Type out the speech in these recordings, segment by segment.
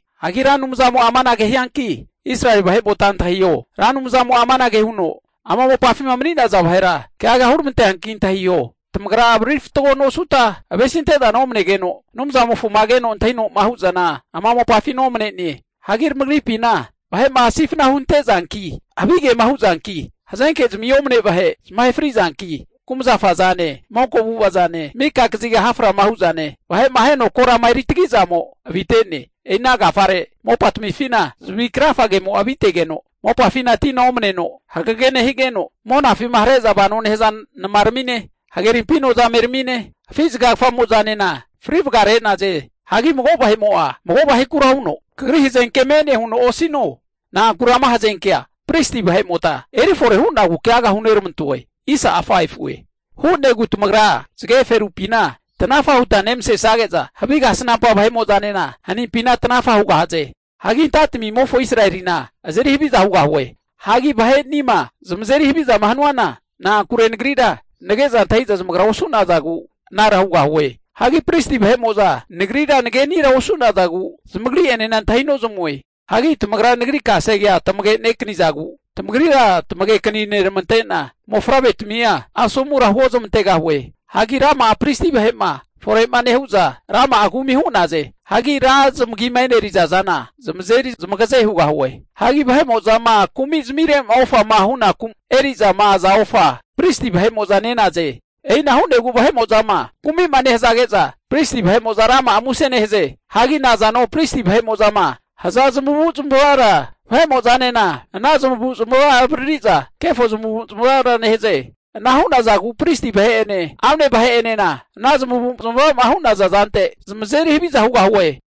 Hagi Ra Anumzamo'a amanage hianki Israeli vahe'mota antahiho, Ra Anumzamo'a amanage huno ama mopafima mani'naza vahera keaga huramanteanki antahiho, Tamagra avariri fatgo nosuta, avesi ante'zana omanegeno, Anumzamofoma keno antahino'ma hu'zana ama mopafina omanene. Hagi tamagripina vahe'ma sifna hunte'zanki, havigema huzanki, hazenkezmi omane vahe zamahe fri'zanki, kumzafa zane, monko avu'avazane, mika kaziga ha' frama hu'zane, vahe'ma aheno korama eri tagi'zamo avite'ne. E'i ana agafare mopatamifina zavi krafagemo'a avitegeno, mopafina tina omaneno hagege nehigeno, monafima hare'za vano nehaza namaramine, hagerimpi nozameramine, afi' zagagafamozanena fri vagare'naze. Hagi mago vahe'mo'a mago vahekura huno kagri hazenke me'ne huno osino. Na'ankure ama hazenkea pristi vahe'mota eri fore hu'nagu keaga huneramantoe. Hu'negu tamagra zage ferupina tanafa huta nemasesage'za, havige kasnampa vahe'mo'zanena hanimpina tanafa hugahaze. Hagi anta'tamimofo Israelina azeri haviza hugahue. Hagi vahe'nima zamazeri havizama hanuana, na'ankure Nagrira nage'za antahiza zamagra osu'nazagu anara hugahue. Hagi pristi vahe'mo'za Nagrira nagenira osu'nagu, zamagri'enena antahi nozamue. Hagi tamagra Nagri kasegea tamagekanizagu, tamagrira tamagekani neramante'na mofavretamia asomura huozmantegahue. Hagi rama'a pristi vahe'ma fore'ma nehu'za, rama'a kumi hu'naze. Hagi ra zamagima eneriza zana zamazeri zamagaze hugahue. Hagi vahe'mo'zama kumizmire'ma ofama hunaku'ma eri'za aza ofa pristi vahe'mo'za ne'naze. E'ina hu'negu vahe'mo'zama kumima nehazage'za, pristi vahe'mo'za rama'a muse nehaze. Hagi nazano pristi vahe'mo'zama haza zamavu zamavara vahe'mo'zanena ana zamavu zamava avaririza kefo zamavu zamavara nehaze. Ana hu'nazagu pristi vahe'ene amne vahe'enena ana zamavu'zmava hu'naza zante zamazeri haviza hugahue.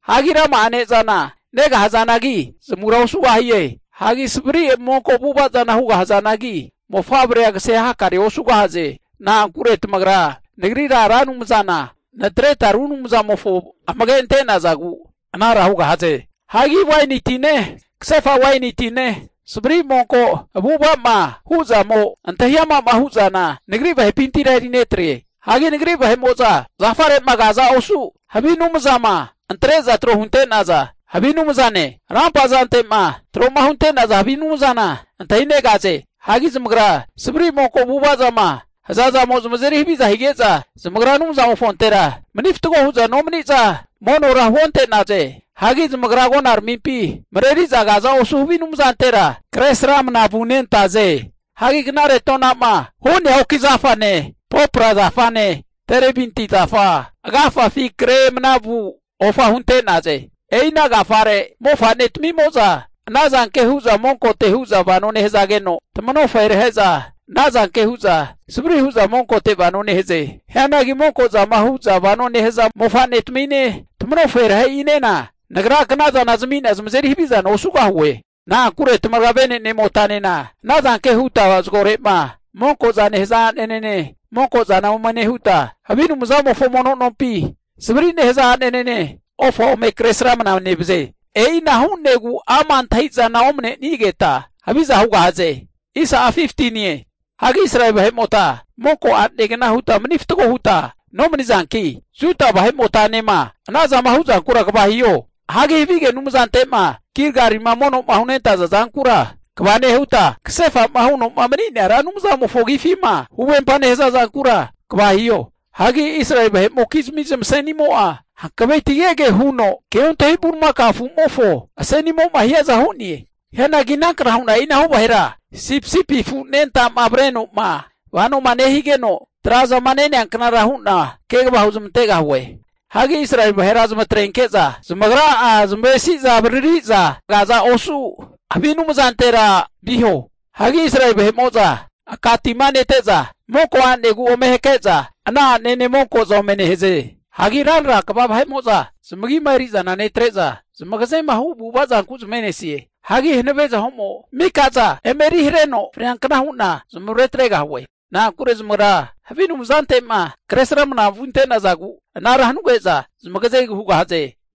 Hagi rama'a ne'zana negahazanagi, zamura osugahie. Hagi savri monko avu'ava zana hugahazanagi, mofavrea kase hakarea osugahaze. Na'ankure tamagra Nagrira Ra Anumzana natreta ru anumzamofo amage ante'nazagu anara hugahaze. Hagi waini tine, kasefa waini tine, savri monko avu'ava'ma hu'zamo, antahi ama'ma hu'zana Nagri vahepintira eri netre. Hagi Nagri vahe'mo'za zafare'ma kaza osu havi anumzama antre'za tro hunte'naza havi anumzane, rampa zante'ma tro'ma hunte'naza havi anumzana antahinegaze. Hagi zamagra savri monko avu'avazama hazazamo zamazeri havia hige'za zamagra Anumzamofontera mani fatgo hu'za nomaniza monora huonte'naze. Hagi zamagra agonaramimpi mareriza kaza osu havi anumzantera kresramana vunentaze. Hagi knare tona'ma hu'nea oki zafane, popra zafane, terebinti zafa agafafi kre manavu ofa hunte'naze. E'ina agafare mofa'netamimo'za ana zanke hu'za monkote hu'za vano nehazageno, tamanoferehe'za ana zanke hu'za savri hu'za monkote vano nehaze. Hianagi monkozama hu'za vanoma nehaza mofa'netamine, tamanoferehe'inena Nagra knazana zami'na zamazeri havizana osugahue. Na'ankure tamagra vene'nemotanena ana zanke huta zagore'ma monkoza nehaza a'nanene monkozana ome nehuta, havi anumzamofo mono nompi savri'ma nehaza a'nene ofa ome Kresramana nevaze. E'ina hu'negu ama' antahi'zana omanenigeta haviza hugahaze. Hagi Israeli vahe'mota monko a'negna huta mani fatgo huta nomanizanki, Juda vahe'motanema ana zama huzankura kva hiho. Hagi havige anumzante'ma Gilgalima mono'ma hunentaza zankura kva nehuta, kasefa'ma huno mani'nea Ra Anumzamofo agifima huvempa nehaza zankura kva hiho. Hagi Israeli vahe'mokizmi zamasenimo'a hankavetigege huno keontahi bulimakao afu'mofo asenimo'ma hiaza hu'ne. Hianagi inankna hu'na e'inahu vahera sipisipi afu anentama avare'noma vanoma nehigeno tra'zama nenea knara hu'na kegava huzmantegahue. Hagi Israeli vahera zamatrenke'za zamagra'a zamavesi'za avaririza kaza osu havi anumzantera viho. Hagi Israeli vahe'mo'za aka tima nete'za monko a'negu ome hake'za ana a'nene monkoza ome nehaze. Hagi ranra kva vahe'mo'za zamagima eri'zana netre'za zamagazema hu avu'ava zanku zamave'nesie. Hagi hanave zaho'mo mikaza eme eri hareno freankna hu'na zamavare atregahue. Na'ankure zamagrama havi anumzantema kresramnama vunte'nazagu anara hanuge'za zamagazegu hugahaze.